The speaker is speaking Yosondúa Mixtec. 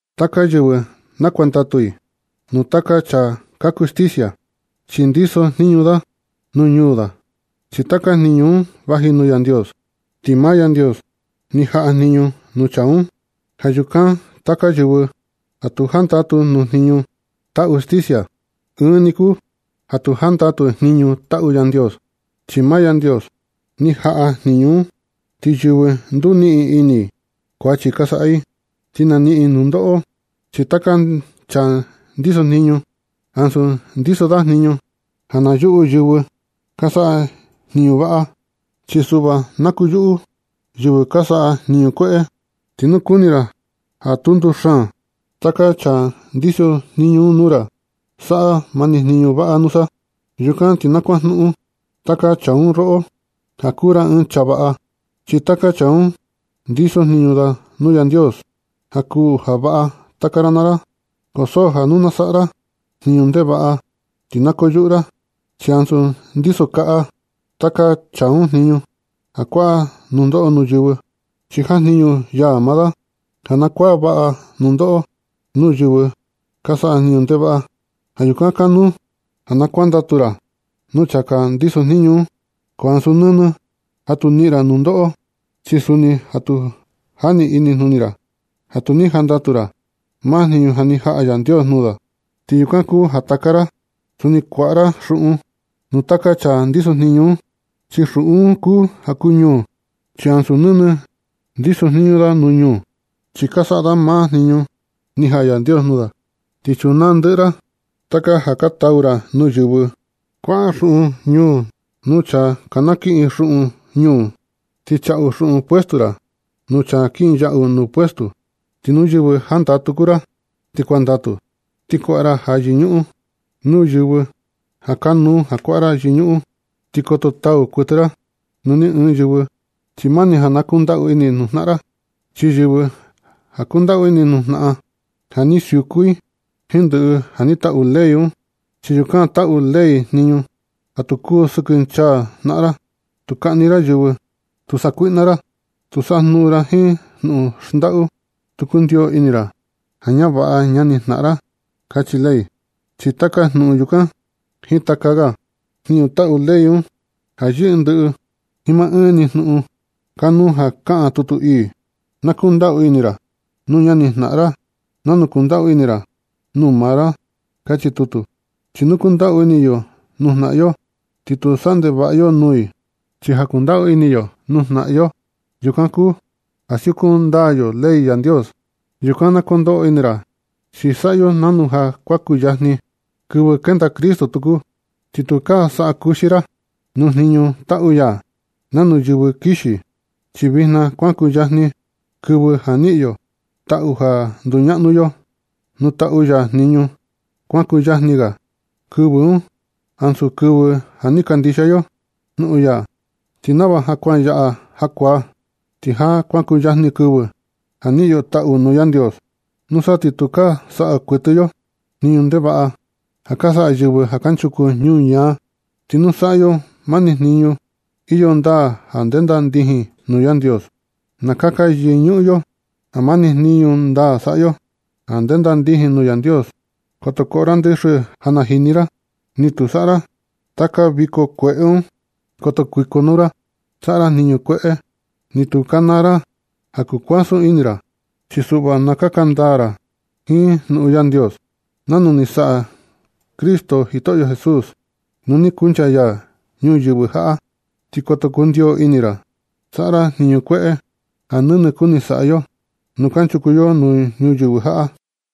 Taka yɨvɨ na kuandatu i nuu taka chaa ka kuu sticia, chi ndisojniñu da nuu ñuu. Chi taka jniñu un vaji nuu Yandios, ti maa Yandios ni jaꞌa jniñu nuu chaa un. Ja yukan taka yɨvɨ ja tu jandatu nuu jniñu taꞌu sticia, ɨɨn ni kuu ja tu jandatu i jniñu taꞌu Yandios, chi maa Yandios ni jaꞌa jniñu un. Ti yɨvɨ nduniꞌin ini, kuachi ka saꞌa i, ti na niꞌin i nundoꞌo. Chi taka chaa ndisojniñu, ansu ndiso da jniñu ja na yuꞌu yɨvɨ ka saꞌa jniñu vaꞌa, chi suꞌva ja na kuyuꞌu yɨvɨ ka saꞌa jniñu kueꞌe. Ti nu kuni ra ja tu nduxaan taka chaa ndisojniñu un nuu ra, saꞌa mani jniñu vaꞌa nusa. Yukan ti na kuajnuꞌun taka chaa un roꞌo ja kuu ra ɨɨn chaa vaꞌa. Chi taka chaa un ndisojniñu da nuu Yandios, ja kuu ja vaꞌa taka ra naa ra. Ko so ja nu na saꞌa ra jniñu ndevaꞌa, ti na ko yuꞌu ra, chi ansu ndiso kaꞌa taka chaa un jniñu ja kuaꞌa da nundoꞌo nuu yɨvɨ. Chi jajniñu ya maa da ja na kuaꞌa vaꞌa da nundoꞌo nuu yɨvɨ ka saꞌa jniñu ndevaꞌa. Ja yukan kanuu ja kuandatu ra nuu chaa ndiso jniñu un. Ko ansu nɨnɨ ja tu niꞌin ra nundoꞌo, chi suni ja tu jani inijnuni ra ja tu ni jandatu ra maa jniñu ni jaꞌa Yandios nuu da. Ti yukan kuu ja taka ra suni kuaꞌa ra xuꞌun nuu taka chaa ndisojniñu un, chi xuꞌun un kuu ja kuu ñuu. Chi ansu nɨnɨ ndisojniñu da nuu ñuu, chi ka saꞌa da maa jniñu ni jaꞌa Yandios nuu da. Ti chunaa ndɨꞌɨ ra taka ja ka tau ra nuu yɨvɨ. Kuaꞌa xuꞌun ñuu nuu chaa na kiꞌin xuꞌun ñuu. Ti chaꞌu xuꞌun puesto ra nuu chaa kinyaꞌu nuu puesto. Ti nuu yɨvɨ jandatu kuu ra, ti kuandatu. Ti kuaꞌa ra ja yɨñuꞌun nuu yɨvɨ ja kanuu kuaꞌa ra ja yɨñuꞌun. Ti koto tau kuɨtɨ ra nuu ni ɨɨn yɨvɨ. Chi mani ja na kundaꞌu ini jnaꞌan ra. Chi yɨvɨ ja kundaꞌu ini jnaꞌan, ja ni siuku i jiin ndɨꞌɨ ja ni taꞌu ley un. Chi yukan taꞌu ley jniñu: “Tu kusɨkɨnchaa jnaꞌan ra. Tu kaꞌni ra yɨvɨ. Tu sakuiꞌna ra. Tu sajnuꞌun ra jiin jnuꞌun xndaꞌu ñaꞌan. Tu kundio ini ra ja ñavaꞌa ñanijnaꞌan ra”, kachi ley. Chi taka jnuꞌun yukan jiin taka ga jniñu taꞌu ley un, ja yɨꞌɨ ndɨꞌɨ jiin maa ɨɨn ni jnuꞌun kanuu ja kaꞌan tutu ii: “Na kundaꞌu ini ra nuu ñani jnaꞌan ra nanu kundaꞌu ini ra nuu maa ra”, kachi tutu. Chi nu kundaꞌu ini yo jnaꞌan yo, ti tu saꞌa ndevaꞌa yo nuu i. Chi ja kundaꞌu ini yo nu jnaꞌan yo, yukan kuu ja siuku ndaa yo nɨ ley Yandios. Yukan na kondoꞌo ini ra, chi saꞌa yo nanu ja kuan kuyajni kɨvɨ kenda Cristo tuku. Ti tukaa saꞌa kuxi ra nuu jniñu taꞌu ya nanu yɨvɨ kixi. Chi vijna kuan kuyajni kɨvɨ ja niꞌin yo taꞌu ja nduñaꞌnu yo nuu taꞌu ya jniñu. Kuan kuyajni ga kɨvɨ un ansu kɨvɨ ja ni kandixia yo jnuꞌun ya. Ti nava ja kuan yaꞌa jakuaa, ti ja kuan kuyajni kɨvɨ ja niꞌin yo taꞌu nuu Yandios. Nusa ti tukaa saꞌa kuɨtɨ yo jniñu ndevaꞌa ja ka saꞌa yɨvɨ kanchuku nuu ñuñaa. Ti na saꞌa yo mani jniñu iyo ndaa ja ndenda ndijin nuu Yandios. Na kaka yɨñuꞌun yo ja mani jniñu ndaa saꞌa yo ja ndenda ndijin nuu Yandios. Koto koꞌo ra ndɨxɨ ja na jini ra, ni tu saꞌa ra taka viko kueꞌe un. Koto kuikonuu ra saꞌa ra jniñu kueꞌe. Ni tu kanaa ra ja kukuasun ini ra. Chi suꞌva na kaka ndaa ra jiin jnuꞌun Yandios nanu ni saꞌa Jitoꞌyo Cristo Jesús nu ni kuncha ya ñuyɨvɨ jaꞌa. Ti koto kundio ini ra saꞌa ra jniñu kueꞌe ja nɨnɨ kuni saꞌa yo nu kanchuku yo ñuyɨvɨ jaꞌa.